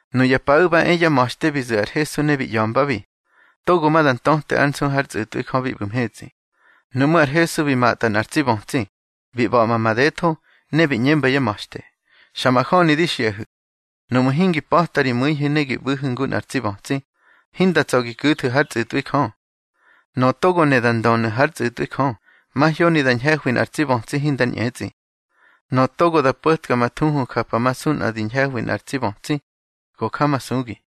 Nuya paꞌu̱ ba e yá ma̱xte bi zu̱ ar Hesu ne bi ꞌya̱mbabi: —Togo ma da ntöte ár nsu hár tsꞌu̱tꞌwi Jö bi ꞌbu̱ mhetsꞌi. Nuꞌmú̱ ar Hesu bi matꞌa nꞌar tsi bötsi, bi ꞌba̱ꞌma madetho. Ne bi ꞌñemba yá ma̱xte: —Xa majöni di xiꞌahu̱, nuꞌmu̱ hingi pa̱ta ri mꞌu̱ihu̱ ne gi ꞌbu̱hu̱ ngu nꞌar tsi bötsi, hinda tsa̱ gi ku̱thu̱ hár tsꞌu̱tꞌwi Jö. Nöꞌö togo ne da ndönu̱ hár tsꞌu̱tꞌwi Jö, mahyoni da ñhe̱hwi nꞌar tsi bötsi hinga ñꞌetsꞌi. Nöꞌö togo da po̱tka ma thuhu japamasu nꞌa di ñhe̱hwi nꞌar tsi bötsi, go jamasugi.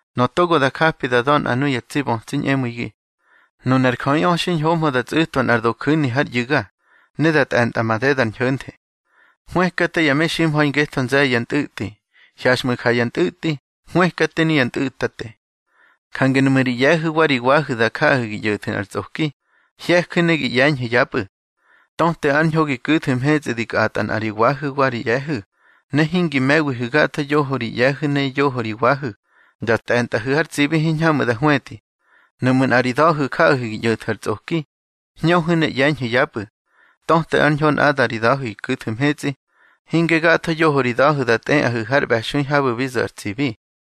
Nöꞌö togo da japi da da̱ nꞌa nuya tsi bötsi ñꞌemu̱igi, nunar jöꞌiꞌö xiñhohmö da tsꞌu̱twa nꞌar doju̱ni hár ꞌyu̱ga, ne da tꞌe̱ntꞌa madeda ar ñho̱nthe. Hwëkate ya meximha̱i ngetho nze̱ye̱ ya ntꞌu̱tꞌi. Hyaxꞌmu̱ ja ya ntꞌu̱tꞌi. Hwëkate nuya ntꞌu̱tate. Jange nuꞌmu̱ ri ꞌye̱hu̱ wa ri wahu̱ da jaꞌahu̱ gi ꞌyo̱thu̱ nꞌar tsꞌoki, hye̱ju̱ ne gi ꞌye̱ñhu̱ yapꞌu̱. Töte ar ñho gi ku̱thu̱ mhetsꞌi di kꞌatꞌa nꞌa ri wahu̱ wa ri ꞌye̱hu̱, ne hingi me̱wihu̱ gatho yoho ri ꞌye̱hu̱ ne yoho ri wahu̱, da tꞌe̱ntꞌahu̱ har tsibi hiñhamꞌu̱ da hwetꞌi. Nuꞌmu̱ nꞌa ri da̱hu̱ jaꞌahu̱ gi ꞌyo̱thu̱ ar tsꞌoki, hñöhu̱ ne ꞌye̱ñhu̱ yapꞌu̱. Töte ár ñho nꞌada ri da̱hu̱ gi ku̱thu̱ mhetsꞌi, hinge gatho yoho ri da̱hu̱ da tꞌeꞌahu̱ har ꞌbe̱xui habu̱ bi zo̱ ar tsibi.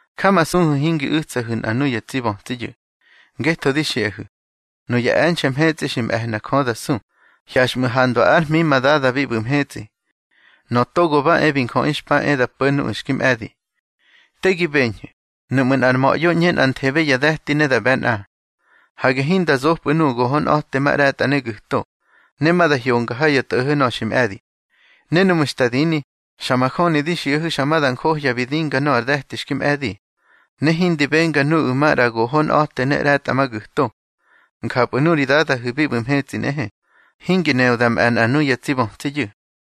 Jamasuhu̱ hingi u̱tsahu̱ nꞌa nuyá tsi bötsiyu̱. Ngetho di xiꞌahu̱, nuya e̱nxe̱ mhetsꞌi xi me̱hna Jö da su, hyaxꞌmu̱ handwa ár hmi ma Dada bi ꞌbu̱ mhetsꞌi. Nöꞌö Togo ba e bi Njöꞌi xpa e da po̱ nuꞌu̱ xki mꞌe̱di. Te gi beñhu̱, nuꞌmu̱ nꞌar ma̱ꞌyo ꞌñe nꞌanthebe ya de̱ti ne da ꞌbe̱ nꞌa, hage hinda zopꞌu̱ nuꞌu̱ gohonꞌa̱temaꞌre̱tꞌa ne gu̱to, ne ma da hyonga ha ya tꞌo̱ho̱ nöꞌö xi mꞌe̱di. Ne núꞌmu̱ xta dini, xa majöni di xiꞌahu̱ xa da njohya bi dinga nöꞌö ar de̱ti xki mꞌe̱di, ne hindi benga nuꞌu̱ maꞌra gohonꞌa̱te ne ꞌre̱tꞌamagu̱to. Njapꞌu̱ nuri Dadahu̱ bi ꞌbu̱ mhetsꞌi nꞌehe, hingi neꞌö da mꞌe̱ nꞌa nuyá tsi bötsiyu̱.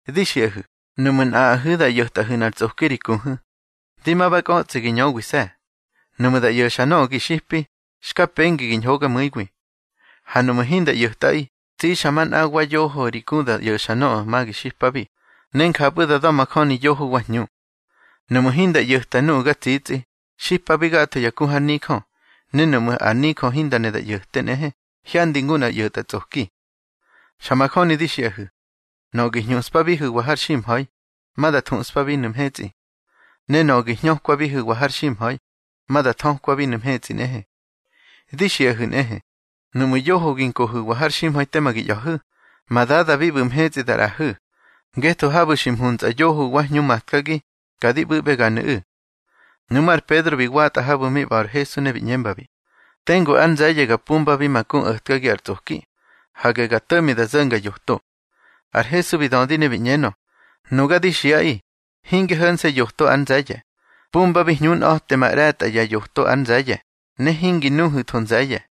Di xiꞌahu̱, nuꞌmu̱ nꞌaꞌahu̱ da ꞌyo̱tꞌahu̱ nꞌar tsꞌoki ri ku, di ma ba kꞌötsꞌi gi ñöwise̱. Nuꞌmu̱ da ꞌyo̱xa nöꞌö gi xipi, xka pengi gi ñhogamu̱iwi. Ha nuꞌmu̱ hinda ꞌyo̱tꞌaꞌi, tsixa manꞌa wa yoho ri ku da ꞌyo̱xa nöꞌö ma gi xipabi, ne njapꞌu̱ da da̱majöni yoho wa hñu. Nuꞌmu̱ hinda ꞌyo̱ta nuꞌu̱ ga tsitsꞌi, xipabi gatho ya ku har nijö, ne nuꞌmu̱ ar nijö hinda ne da ꞌyo̱te nꞌehe, hyandi ngu nꞌar ꞌyo̱tꞌatsꞌoki. Xa majöni di xiꞌahu̱, nöꞌö gi hñuꞌspabihu̱wa har ximha̱i, ma da thuꞌspabinu̱ mhetsꞌi, ne nöꞌö gi hñökwabihu̱wa har ximha̱i, ma da thökwabinu̱ mhetsꞌi nꞌehe. Di xiꞌahu̱ nꞌehe, nuꞌmu̱ yoho gi nkohu̱wa har ximha̱i tema gi ꞌya̱hu̱, ma Dada bi ꞌbu̱ mhetsꞌi da ꞌraꞌahu̱. Ngetho habu̱ xi mhuntsꞌa yoho wa hñu matkagi, ka di ꞌbu̱ꞌbeganu̱ꞌu̱. Nuꞌmú̱ ar Pedro bi watꞌa habu̱ mi ꞌba̱ ar Hesu ne bi ꞌñembabi: —Tengu ár nze̱ye̱ ga pumbabi ma ku o̱tkagi ar tsꞌoki. Hage ga to̱ꞌmi da zo̱nga yoto. Ar Hesu bi dödi ne bi ꞌñenö: —Nuga di xiꞌaꞌi, hinge ho̱nse̱ yoto ar nze̱ye̱. Pumbabi hñunꞌa̱temaꞌre̱tꞌa ya yoto ár nze̱ye̱, ne hingi nuhu̱tho nze̱ye̱.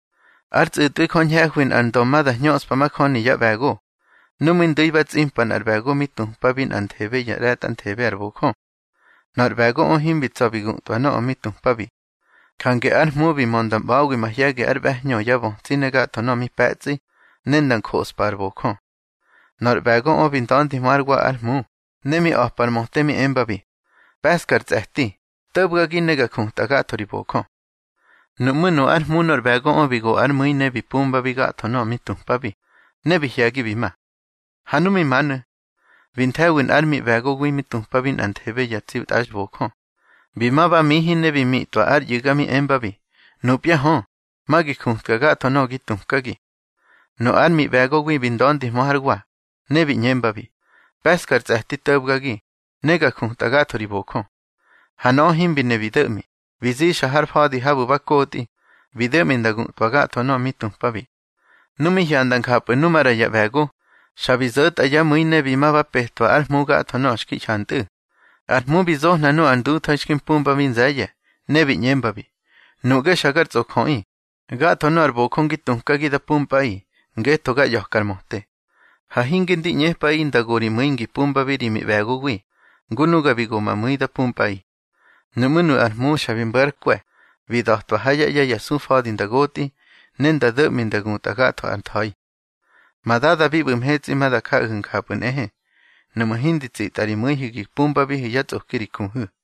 Ár tsꞌu̱tꞌwi Jö ñhe̱hwi nꞌar ndö ma da hñöꞌspa majöni yá ꞌbe̱go. Nu mi ndu̱i ba tsꞌimpa nꞌar ꞌbe̱go mi tupabi nꞌanthebe ya ꞌre̱tꞌanthebe ar bojö. Nöꞌö ar ꞌbe̱goꞌö himbi tsa̱ bi gutꞌwa nöꞌö mi tupabi. Jange ár hmu bi mö nda ꞌba̱wi mahye̱gi ár ꞌbe̱hñö, yá bötsi ne gatho nöꞌö mi pe̱tsꞌi, ne nda njoꞌspa ár bojö. Nöꞌö ar ꞌbe̱goꞌö bi nda̱ndihmö hár wa ár hmu, ne mi a̱pa ar möte mi embabi: Pe̱ꞌska ar tsꞌe̱ti, to̱bgagi ne ga jutꞌa gatho ri bojö. Nuꞌmú̱ nu ár hmu nor ꞌbe̱goꞌö bi go ár mu̱i ne bi pumbabi gatho nöꞌö mi tupabi, ne bi hye̱gi bi ma. Ha nu mi manu̱, bi nthe̱wi nꞌár miꞌbe̱gowi mi tupabi nꞌanthebe ya tsi tꞌaxbojö. Bi ma ba mihi ne bi mitꞌwa ár ꞌyu̱ga mi embabi: Nupya hö, ma gi jutka gatho nöꞌö gi tukagi. Nu ár miꞌbe̱gowi bi nda̱ndihmö hár wa, ne bi ꞌñembabi: Pe̱ꞌska ar tsꞌe̱ti to̱bgagi, ne ga jutꞌa gatho ri bojö. Ha nöꞌö himbi ne bi do̱ꞌmi. Bi zixa har fa̱di habu̱ ba kotꞌi, bi do̱ꞌmi nda gutꞌwa gatho nöꞌö mi tupabi. Nu mi hyanda njapꞌu̱ nu maꞌra ya ꞌbe̱go, xa bi zo̱tꞌa yá mu̱i ne bi ma ba petwa ár hmu gatho nöꞌö xki hyantꞌu̱. Ar hmu bi zohna nu ar ndutha̱i xki mpumbabi nze̱ye̱, ne bi ꞌñembabi: Nuꞌge xa gar tsꞌojöꞌi. Gatho nöꞌö ar bojö ngi tukagi da pumpꞌaꞌi, ngetho ga ꞌya̱ka ar möte. Ha hinge ndi ꞌñepꞌaꞌi nda go ri mu̱i ngi pumpabi ri miꞌbe̱gowi, ngu nuga bi go ma mu̱i da pumpꞌaꞌi. Nuꞌmú̱ nu ár hmu xa bi mbo̱ ár kwe̱, bi da̱twa ha yá ꞌye̱ ya sufa̱di nda gotꞌi, ne nda do̱ꞌmi nda gutꞌa gatho ár tha̱i. Ma Dada bi ꞌbu̱ mhetsꞌi ma da jaꞌahu̱ njapꞌu̱ nꞌehe, nuꞌmu̱ hindi tsitꞌa ri mu̱ihu̱ gi pumbabihu̱ yá tsꞌoki ri kuhu̱.